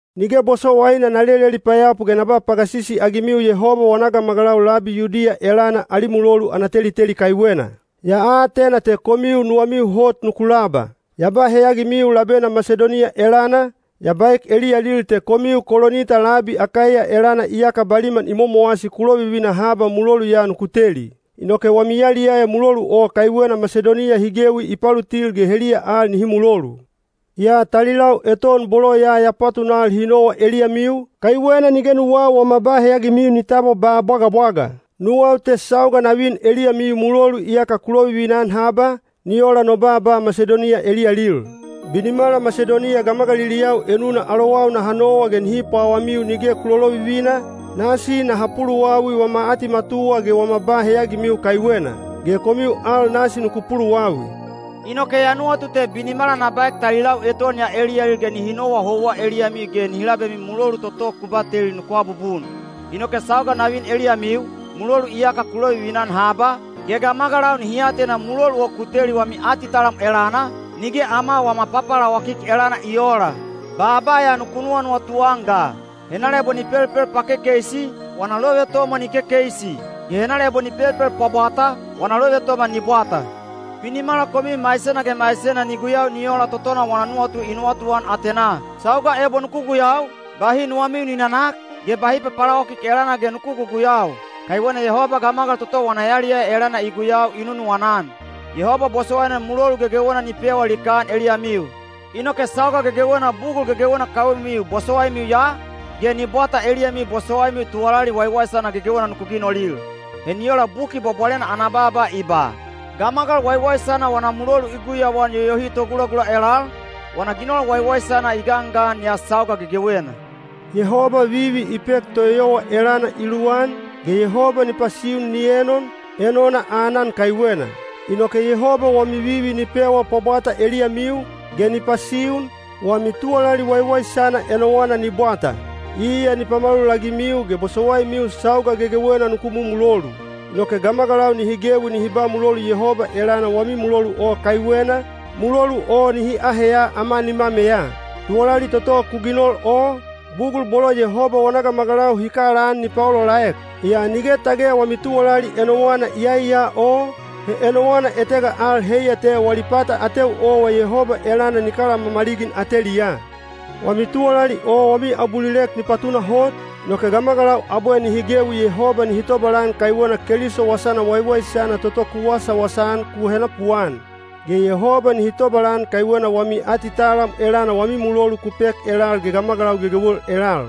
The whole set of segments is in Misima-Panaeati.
Nige bosowaina na leleli payapu ge na ba pagasisi-agimiu Yehoba wana gamagalau labi Yudiya elana ali mulolu ana teliteli kaiwena. Ya atena te komiu nuwamiu hot nuku laba. Ya ba heyagimiu labena Masidoniya elana, ya baek eliyalil te komiu Kolinita labi Akaiya elana iyaka baliman i momowasi ku lovivina haba mulolu ya nuku teli. Inoke wami yaliyaya mulolu o kaiwena Masidoniya hi gewi i palutil ge heliya al nihi mulolu. Yaa talilau eton bolo ya ya patunal hi nowa eliyamiu, kaiwena nige nuwau wama ba heyagimiu ni tabwa ba bwagabwaga. Nuwau te sauga na vin eliyamiu mulolu iyaka ku lovivina-an haba, ni ola no baaba Masidoniya eliyalil. Binimala Masidoniya gamagaliliyau enuna alowau naha nowa ge nihi pwawamiu nige ku lolovivina, nasi naha puluwawi wama atimatuwa ge wama ba heyagimiu kaiwena. (Ge komiu al nasi nuku puluwawi.) Inoke ya nuwatu te binimala na baek talilau eton ya eliyalil ge nihi nowa houwa eliyamiu ge nihi labemiu mulolu toto ku bateli nuku abubun. Inoke sauga na vin eliyamiu, mulolu iyaka ku lovivina-an haba, ge gamagalau nihi atena mulolu o ku teli wami atitalam elana, nige ama wama papalawakik elana i oola. Baaba ya nuku nuwanuwatu-an ga: henala ebo ni pelpel pakekeisi, wana lovetomwa ni kekeisi, ge henala ebo ni pelpel pwabwata, wana lovetomwa ni bwata. Binimala komiu maisena ge maisena ni guyau ni ola totona wana nuwatu i nuwatuan atenaa. Sauga ebo nuku guyau, bahi nuwamiu ni nanak, ge bahi papalawakik elana ge nuku guguyau. Kaiwena Yehoba gamagal toto wana yaliyaya elana i guyau i nunuwana-an. Yehoba bosowaina mulolu gegewena ni pewa likaan eliyamiu. Inoke sauga gegewena bugul gegewena kaiwemiu bosowaimiu ya, ge ni bwata eliyamiu bosowaimiu tuwalali waiwaisana gegewena nuku ginolil. He ni ola Buki Bwabwalena ana baaba i ba: “Gamagal waiwaisana wana mulolu i guyauan yoyohi togulagula elal, wana ginol waiwaisana i gangan ya sauga gegewena.” Yehoba vivi i pek toeyowa elana i luwan, ge Yehoba ni pasiun ni enon, enona aanan kaiwena. Inoke Yehoba wami vivi ni pewa pwabwata eliyamiu, ge ni pasiun, wami tuwalali waiwaisana enowana ni bwata. Iya ni pamalulagimiu ge bosowaimiu sauga gegewena nuku mumulolu. Inoke gamagalau nihi gewi nihi ba mulolu Yehoba elana wami mulolu o kaiwena, mulolu o nihi aheya ama nimameya. Tuwalali toto ku ginol o, bugul bolo Yehoba wana gamagalau hi kalaan ni paolaolaek. Yaa nige tage wami tuwalali enowana iyai ya o, he enowana etega al heiya te wali pata ateu owa Yehoba elana ni kalamamaligin ateliyaa. Wami tuwalali o wami abulilek ni patunahot, inoke gamagalau abwe nihi gewi Yehoba nihi tobalan kaiwena Keliso Wasana Waiwaisana toto ku wasawasa-an ku henapuan. Ge Yehoba nihi tobalan kaiwena wami atitalam elana wami mulolu ku pek elal ge gamagalau gegewel elal.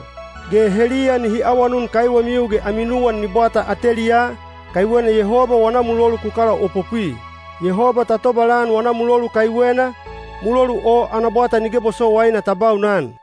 Ge heliya nihi awanun kaiwemiu ge ami nuwan ni bwata ateliyaa, kaiwena Yehoba wana mulolu ku kalaopopwi. Yehoba ta tobalan wana mulolu kaiwena, mulolu o ana bwata nige bosowaina ta baunan!